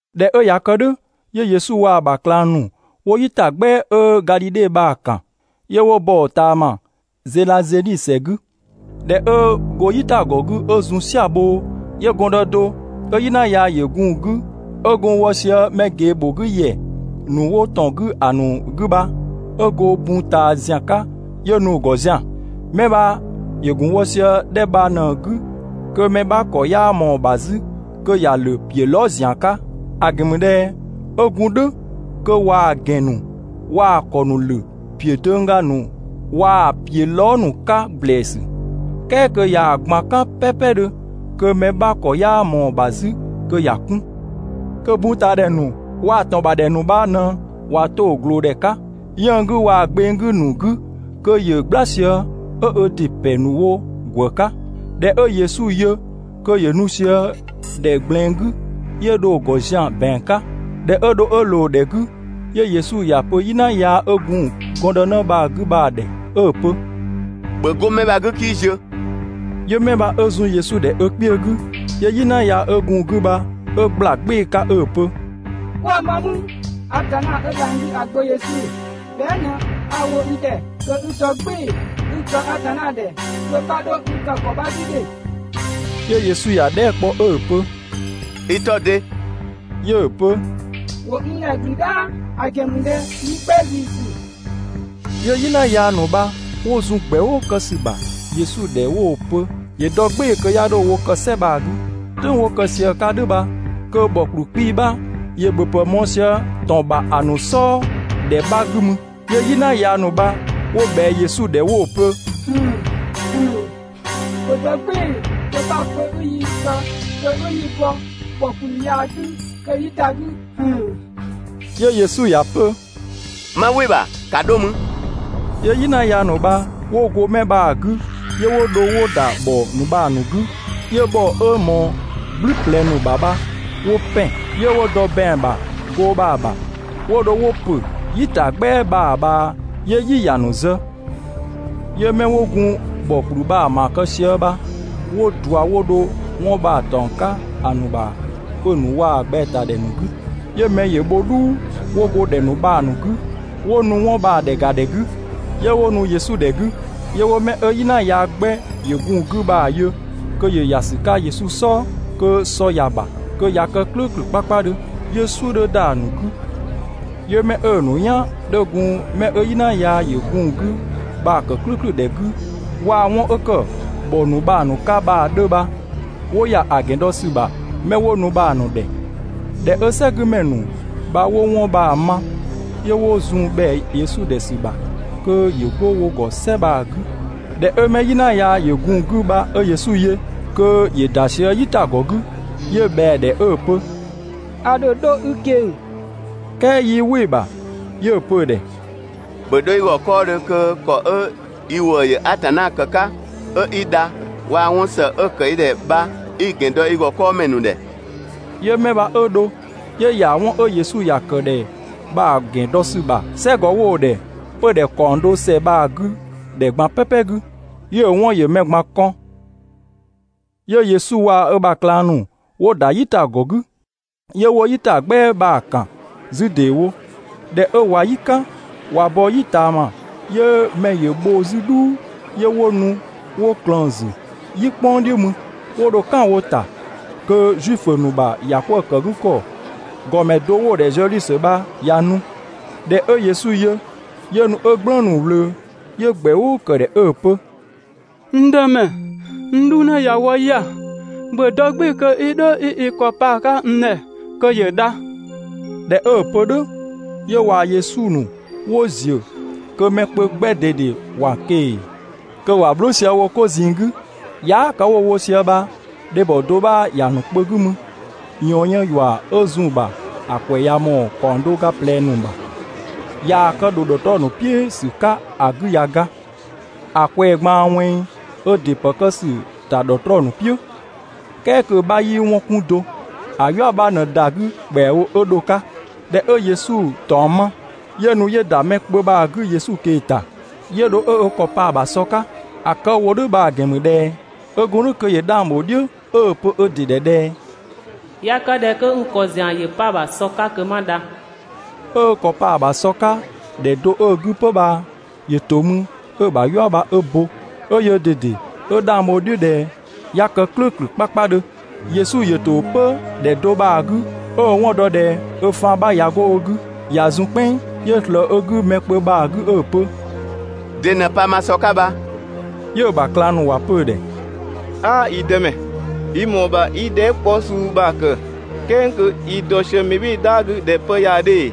꞊Dhɛ 'ö ꞊ya kë "dhʋ̈, 'yö Yesu waa‑ ‑bha ꞊klang ‑nu 'wo "yitagbɛa 'ö Gadhidhe bha‑ ‑kan, 'yö 'wo bɔ‑ ꞊taama Zedhazeni ‑sɛ 'gü. ꞊Dhɛ 'ö go "yitagɔ 'gü 'ö zun "sia‑ bhoo, 'yö gɔndë do 'ö "yina yaa ‑yö gun‑ 'gü 'ö gun wɔ sië mɛ ꞊gee ‑bho 'gü ‑yɛ ‑nu 'wo ‑tɔn 'gü ‑a ‑nu 'gü bha, 'ö go bun ꞊taa ‑zian 'ka 'yö nu‑ ‑gɔ zian‑. 'Mɛ bha ‑yö ‑gun wɔ sië ‑dhɛ bha ꞊në‑ 'gü, kö mɛ 'bha ‑kɔ 'yaa ꞊mɔɔ‑ ‑bha 'zü kö ‑ya ‑lö ‑piö lɔɔ" ‑zian 'ka. ‑A ‑gɛn ‑mü ꞊dhɛ 'ö gun "dhʋ̈ kö ꞊waa‑ ‑gɛn ‑nu waa‑ ‑kɔ ‑nu ‑lö ‑piö döngga ‑nu waa‑ ‑piö lɔɔ" ‑nu 'ka ‑blɛɛsü, "kɛɛ kö ꞊yaa‑ ꞊gban "kan "pɛɛpɛdhö kö mɛ 'bha ‑kɔ 'yaa ꞊mɔɔ‑ ‑bha 'zü kö ‑ya 'kun. Kö buntaadhɛ ‑nu waa‑ ‑tɔn ‑bha ‑dhɛ ‑nu bha ꞊në ꞊wa 'to‑ ꞊gloodhɛ 'ka 'yënng‑ 'gü waa‑ gbeng 'gü ‑nu 'gü kö ‑yö "gbla sië, 'ö ö ‑dɩ ‑pɛ ‑nu wo ‑gwë 'ka. ꞊Dhɛ 'ö Yesu yö kö ‑yö nu sië ‑dhɛ ꞊gblɛɛn 'gü, 'yö dho‑ ‑gɔ zian‑ ‑bɛang 'ka. ꞊Dhɛ 'ö dho 'ö ꞊loo‑ ‑dhɛ 'gü, 'yö Yesu ‑ya pö "yina yaa 'ö gun gɔndënë bha‑ 'gü bha‑ ‑dhɛ 'ö‑ pö: «‑Bhö 'go 'mɛ bha‑ 'gü 'kii ziö!» 'Yö 'mɛ bha 'ö zun Yesu ‑dhɛ ö kpiö 'gü, 'yö "yina 'ö gun‑ 'gü bha 'ö ꞊gbla "gbɩɩ‑ 'ka 'ö‑ pö: «'Kwa ma mü, Atanna 'ö dhang‑ 'gü ‑a Gbö Yesu? Bhɛa" ꞊në 'a‑ wo i ‑dhɛ kö i dɔ "gbɩɩ‑ kö 'i‑ kë Atanna ‑dhɛ kö 'bha 'dho n kë ‑kɔ 'bha 'gü ‑dhe!» 'Yö Yesu ‑ya dhɛɛ" kpɔ 'ö‑ pö: «I 'tɔ‑ de?» 'Yö‑ pö: «‑Wo n ‑dhɛ ‑gblü "dhaa, ‑a ‑gɛn ‑mü ꞊dhɛ yi 'gbɛ ‑ziisü.» 'Yö "yina yaa ‑nu bha 'wo zun ‑gbɛʋʋ kë ‑sü bha Yesu ‑dhɛ 'wo‑ pö ‑yö dɔ "gbɩɩ‑ kö 'ya 'dho wo kë "sɛ bha‑ 'gü. "Tʋ̈ng 'wo kë sië‑ 'ka "dhʋ̈ bha kö ‑bhɔ ‑kpluu 'kpii‑ 'bha ‑yö ‑bhöpë mɔɔ‑ sië ‑tɔn ‑bha ‑a ‑nu "sɔɔ ‑dhɛ 'bha 'gü mü, 'yö "yina yaa ‑nu bha 'wo ꞊bhɛa Yesu ‑dhɛ 'wo‑ pö: «‑Bhö dɔ "gbɩɩ‑ kö 'bha‑ pö 'i yi kë, kö 'i yi bɔ ‑bhɔ ‑kplü ya‑ 'gü kö 'yi ‑da 'gü!» 'Yö Yesu ‑ya pö: «'Ma "wɩ‑ ‑bha, ‑ka 'dho mü!» 'Yö "yina yaa ‑nu bha 'wo go 'mɛ bha‑ 'gü, 'yö 'wo dho 'wo ‑da ‑bhɔ ‑nu bha‑ ‑nu 'gü, 'yö ‑bhɔ 'ö ꞊mɔɔ "gblü ꞊plɛ ‑nu ‑bha bha 'wo ‑pɛn, 'yö 'wo dɔ ‑bɛang ‑bha goo bha‑ ‑bha, 'wo dho 'wo ‑pö "yitagbɛa bha‑ ꞊bhaa, 'yö "yi ‑ya ‑nu zë. 'Yö 'mɛ 'wo gun ‑bhɔ ‑kplü bha‑ ‑maa kë sië bha, 'wo ꞊dua 'wo dho 'wɔn bha‑ ‑taɔng 'ka ‑a ‑nu ‑bha 'pö‑ ‑nu waa‑ ꞊gbɛatadhɛ ‑nu 'gü. 'Yö mɛ ‑yö bho "dhuu 'wo go ‑dhɛ ‑nu bha‑ 'gü, 'wo nu 'wɔn bha‑ ‑dhɛ ‑ga ‑dhɛ 'gü. 'Yö 'wo nu Yesu ‑dhɛ 'gü, 'yö 'wo 'mɛ 'ö "yina yaa "gblü ꞊plɛ ‑yö gun‑ 'gü bha‑ yö kö ‑yö ‑ya ‑sü 'ka Yesu "sɔɔ, kö sɔ ‑ya ‑bha, kö ꞊ya kë "klʋ̈ʋ̈klʋ̈ 'kpakpadhö, 'yö‑ "suʋ̈ 'dhö ‑da ‑a ‑nu 'gü. 'Yö 'mɛ 'ö‑ ‑nu "yan 'dhö gun 'mɛ 'ö "yina yaa ‑yö gun‑ 'gü bha‑ ‑kë "klʋ̈ʋ̈klʋ̈ ‑dhɛ 'gü, waa‑ 'wɔn 'ö ‑kë ‑bhɔ ‑nu bha‑ ‑nu 'ka bha‑ 'dhö bha, 'wo ‑ya ‑a ‑gɛn dɔ ‑sü ‑bha 'mɛ 'wo nu bha‑ ‑nu ‑dhɛ. ꞊Dhɛ 'ö "sɛgümɛ ‑nu bha 'wo 'wɔn bha‑ ma, 'yö 'wo zun ‑bhɛa Yesu ‑dhɛ ‑sü ‑bha kö ‑yö 'go wo ‑gɔ "sɛ bha‑ 'gü. ꞊Dhɛ 'ö 'mɛ 'ö "yina yaa ‑yö gun‑ 'gü bha 'ö Yesu yö kö ‑yö ‑da sië "yitagɔ 'gü, 'yö ꞊bhɛa‑ ‑dhɛ 'ö‑ pö: «A ‑dho 'dho i ꞊keng‑.» "Kɛɛ 'yii "wɩ‑ ‑bha, 'yö‑ pö‑ ‑dhɛ: «‑Bhö 'dho i ‑gɔ 'kɔɔdhö kö ‑kɔ 'ö i ‑wëë ‑yö Atanna ‑kë 'ka, 'ö i dha, waa‑ 'wɔn ‑së 'ö‑ ‑kë i ‑dhɛ bha 'i‑ ‑gɛn dɔ i ‑gɔ 'kɔɔmɛ ‑nu ‑dhɛ. 'Yö 'mɛ bha 'ö dho, 'yö ‑ya 'wɔn 'ö Yesu ‑ya ‑kë ‑dhɛ bha‑ ‑gɛn dɔ ‑sü bha "sɛgɔ 'wo‑ ‑dhɛ 'pödhɛ ‑kaɔng do ‑sɛ bha‑ 'gü ‑dhɛ ꞊gban "pɛpɛ 'gü. 'Yö‑ 'wɔn ‑yö mɛ ꞊gban kɔn. 'Yö Yesu waa‑ ö ‑bha ꞊klang 'nu 'wo ‑da "yitagɔ 'gü, 'yö 'wo "yitagbɛa bha‑ ‑kan 'zü ‑deewo. ꞊Dhɛ 'ö ꞊wa "yi "kan, ꞊wa bɔ "yi ꞊taama, 'yö mɛ ‑yö bho 'zü "dhuu, 'yö 'wo nu 'wo ꞊klëën‑ ‑zü "yi "kpʋng "dhiʋ̈ mü. 'Wo dho "kan wo ‑ta kö Zuifö ‑nu ‑bha ‑yakwëëkëgükɔ ‑gɔmɛ do 'wo‑ ‑dhɛ Zɛdhiusö bha, ꞊ya nu. ꞊Dhɛ 'ö Yesu yö, 'yö nu 'ö "gblëënu‑ ꞊wlöö, 'yö ‑gbɛ "ʋʋ ‑kë ‑dhɛ 'ö‑ pö: «N Dëmɛ, n 'dhunë ‑ya wɔ 'ya‑, ‑bhö dɔ "gbɩɩ‑ kö 'i 'dho 'i i ‑kɔ 'pa‑ 'ka n ‑dhɛ kö ‑yö dha.» ꞊Dhɛ 'ö‑ pö "dhʋ̈, 'yö waa‑ Yesu ‑nu 'wo ‑ziö, kö mɛ kpö 'gbɛ ꞊dede ‑wa ꞊keng‑ kö ‑wa bhlʋʋ sië wo 'ko ꞊zinng 'gü. Yaa" kë 'wo‑ wo sië bha, dhebhɔ do 'bha ‑ya ‑nu kpö 'gü mü, ꞊yɔɔn yën ‑yua 'ö zun‑ ‑bha ‑a ‑kwɛ ꞊ya ꞊mɔɔ ‑kaɔng do ga ꞊plɛ ‑nu ‑bha. ꞊Yaa‑ kë ‑dho ‑dhɔtrɔɔ ‑nu "piʋ̈ ‑sü 'ka ‑a 'gü ꞊ya ga. ‑A ꞊kwɛɛ ꞊gbaan ꞊wɛnng ö ‑dɩ ‑pë kë ‑sü ‑ta ‑dhɔtrɔɔ ‑nu "piʋ̈, "kɛɛ kö‑ 'bha 'yii 'wɔn 'kun do, ‑a "yua 'bha ꞊në ‑da 'gü ‑kpɛawo 'ö dho‑ 'ka. ꞊Dhɛ 'ö Yesu ‑taɔng ma, 'yö nu 'yö ‑da mɛ kpö bha‑ 'gü Yesu ꞊kee‑ ‑ta, 'yö dho 'ö ö ‑kɔ pa‑ ‑bha sɔ 'ka. ‑A kë 'ö‑ wo "dhʋ̈ bha‑ ‑gɛn ‑mü ꞊dhɛ 'ö gun "dhʋ̈ kö ‑yö 'dhang ‑bho "dhiʋ̈, 'ö‑ pö ö ‑dɩ ‑dhɛ ꞊dhɛ: «꞊Ya kë ꞊dhɛ kö n ‑kɔ ‑zian ‑yö 'pa‑ ‑bha sɔ 'ka kö 'ma dha.» 'Ö ö ‑kɔ pa‑ ‑bha sɔ 'ka ‑dhɛ do 'ö‑ 'gü 'pö bha, ‑yö ‑to mü 'ö‑ ‑bha "yua bha 'ö bo, 'ö yöö ꞊dede 'ö 'dhang bho‑ "dhiʋ̈ ꞊dhɛ 'ya kë "klʋ̈ʋ̈klʋ̈ 'kpakpadhö. Yesu ‑yö ‑to 'pö ‑dhɛ do bha‑ 'gü 'ö‑ 'wɔn dɔ ꞊dhɛ ö faan 'bha ꞊ya 'go ö 'gü ꞊ya zun "kpɛnng, 'yö ꞊slëë ö 'gü mɛ kpö bha‑ 'gü 'ö‑ pö: «De ꞊në pa ma sɔ 'ka bha?» 'Yö‑ ‑bha ꞊klang ‑nu ‑wa pö‑ ‑dhɛ: «'Aa, yi Dëmɛ, i ‑mɔɔ ‑bha 'i dhɛɛ" 'kpɔ suu bha‑ ‑kë, "kɛɛ kö i dɔ sië mɛ "bhɩɩ‑ "dhaa 'gü ꞊dhɛ 'pë 'ya 'dhö ‑ee?»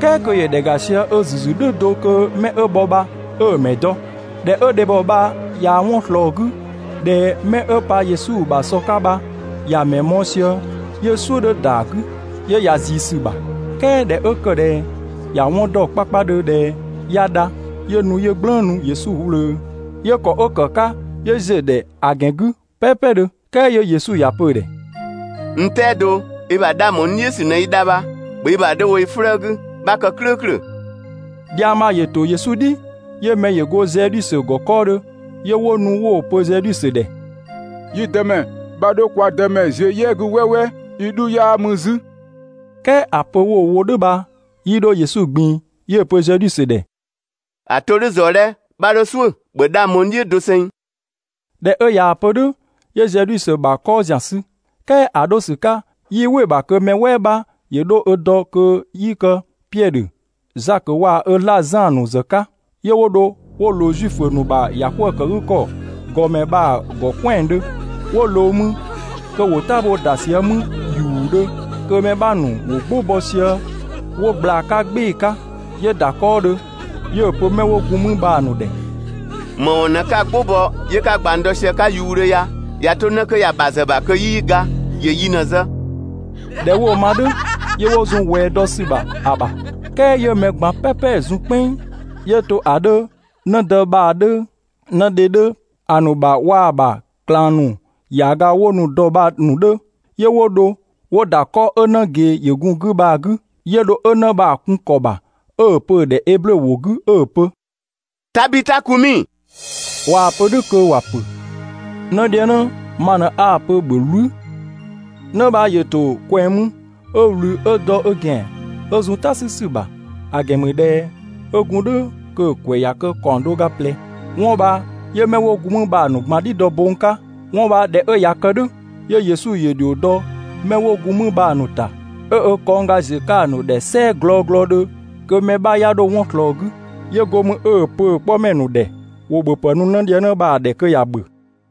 "Kɛɛ kö ‑yö ‑dhɛ ‑ga sië ö ‑zü ‑zü "dhʋ̈ do kö 'mɛ 'ö bhɔ bha 'ö‑ mɛ dɔ. ꞊Dhɛ 'ö dhebhɔ bha ꞊ya 'wɔn ꞊slɔɔ 'gü ꞊dhɛ mɛ 'ö pa Yesu ‑bha sɔ 'ka bha, ‑ya mɛ mɔɔ‑ sië, 'yö "suʋ̈ 'dhö ‑da 'gü, 'yö ‑ya ꞊zii ‑sü ‑bha, "kɛɛ ꞊dhɛ 'ö ‑kë ꞊dhɛ ‑ya 'wɔn dɔ 'kpakpadhö ꞊dhɛ 'ya dha, 'yö nu 'yö "gblëënu Yesu ꞊wlöö, 'yö ‑kɔ 'ö ‑kë 'ka 'yö ‑ziö ‑dhɛ ‑a ‑gɛn 'gü "pɛɛpɛdhö. "Kɛɛ 'yö Yesu ‑ya pö‑ ‑dhɛ: «N "tɛado, i ‑bha 'dhang bho n "dhiʋ̈ ‑sü ꞊në i dha bha. ‑Bhö i ‑bha 'dho wo i 'flëë‑ 'gü, 'bha kë "klʋ̈ʋ̈klʋ̈.» Dhiang bha ‑yö ‑to Yesu "dhi, 'yö mɛ ‑yö go Zɛdhiusö ‑gɔ 'kɔɔdhö, 'yö 'wo nu 'wo‑ pö Zɛdhiusö ‑dhɛ: «Yi Dëmɛ, 'bha 'dho kwa Dëmɛ ziö "yɛ 'gü "wɛɛwɛɛ, i 'dhu 'yaa mü 'zü, "kɛɛ ‑a pö 'wo‑ wo "dhʋ̈ bha, 'yii 'dho Yesu ꞊gbin‑, 'yö‑ pö Zɛdhiusö ‑dhɛ: «‑A 'to "dhʋ̈ ꞊zɔɔ 'dhɛ, 'bha 'dho "suʋ̈, ‑bhö 'dhang bho n "dhiʋ̈ doseng!» ꞊Dhɛ 'ö ꞊yaa‑ pö "dhʋ̈, 'yö Zɛdhiusö ‑bha 'kɔɔ ‑zian sü, "kɛɛ ‑a 'dho ‑sü 'ka 'yii "wɩ‑ ‑bha kö mɛ "wɛɛ 'bha ‑yö 'dho 'ö dɔ kö 'yii kë Piɛdhö, Zakö waa‑ ö 'zlaa‑ Zan ‑nu ‑zë 'ka. 'Yö 'wo dho 'wo ꞊loo Zuifö ‑nu ‑bha ‑yakwëëkëgükɔ ‑gɔmɛ bha‑ ‑gɔ "kwɛandhö. 'Wo ꞊loo mü kö ‑wo "tabhoo ‑da sië mü ‑yuudhö, kö mɛ 'bha ‑nu ‑wo "gbʋ bɔ sië 'wo ꞊gbla‑ 'ka "gbɩɩ‑ 'ka. 'Yö ‑da 'kɔɔdhö, 'yö‑ pö 'mɛ 'wo gun mü bha‑ ‑nu ‑dhɛ: «‑Më ‑wɔn ꞊në 'ka‑ "gbʋ bɔ 'yö 'ka ꞊gbang dɔ sië‑ 'ka ‑yuudhö ya? ꞊Ya 'to 'në 'kö ya‑ ‑bha ‑zë ‑bha kö 'yii ga, ‑yö yi ꞊në‑ zë. ꞊Dhɛ 'wo‑ ma "dhʋ̈, 'yö 'wo zun ꞊wɛɛ dɔ ‑sü ‑bha ‑a ‑bha. "Kɛɛ 'yö mɛ ꞊gban "pɛpɛ zun "kpɛnng, 'yö to ‑a 'dhö, 'në dë bha‑ 'dhö, 'në dhe 'dhö ‑a ‑nu ‑bha waa‑ ‑bha ꞊klang ‑nu ‑yaaga 'wo nu‑ dɔ bha‑ ‑nu 'dhö, 'yö 'wo dho 'wo ‑da 'kɔ 'ö 'në ꞊gee ‑yö gun‑ 'gü bha‑ 'gü. 'Yö dho 'ö 'në bha‑ kun‑ ‑kɔ ‑bha 'ö‑ pö‑ ‑dhɛ (eblö ‑wʋ 'gü) 'ö‑ pö: «Tadhita kumi!» ꞊Waa‑ pö "dhʋ̈ kö ‑wa pö: «'Nëdhiëngnë, ma ꞊në 'a‑ pö, ‑bhö "wlü!» 'Në bha ‑yö ‑to ꞊kwɛng mü 'ö ꞊wlü 'ö dɔ ö ‑gɛan, 'ö zun "ta 'sü ‑sü ‑bha, ‑a ‑gɛn ‑mü ꞊dhɛ 'ö gun "dhʋ̈ kö‑ ‑kwɛ ꞊ya kë ‑kaɔng do ga ꞊plɛ. 'Wɔn bha 'yö 'mɛ 'wo gun mü bha‑ ‑nu ꞊gban "dhi dɔ bong 'ka. 'Wɔn bha ꞊dhɛ 'ö ꞊ya kë "dhʋ̈, 'yö Yesu ‑yö ‑dhio dɔ 'mɛ 'wo gun mü bha‑ ‑nu ‑ta, 'ö ö kɔngga ziö‑ 'ka‑ ‑nu ‑dhɛ "sɛɛ glɔglɔdhö kö mɛ 'bha 'ya 'dho 'wɔn ꞊slɔɔ‑ 'gü. 'Yö go mü 'ö‑ pö‑ 'kpɔmɛ ‑nu ‑dhɛ ‑wo ‑bhöpë nu 'nëdhiëngnë bha‑ ‑dhɛ kö ‑ya ‑bhö.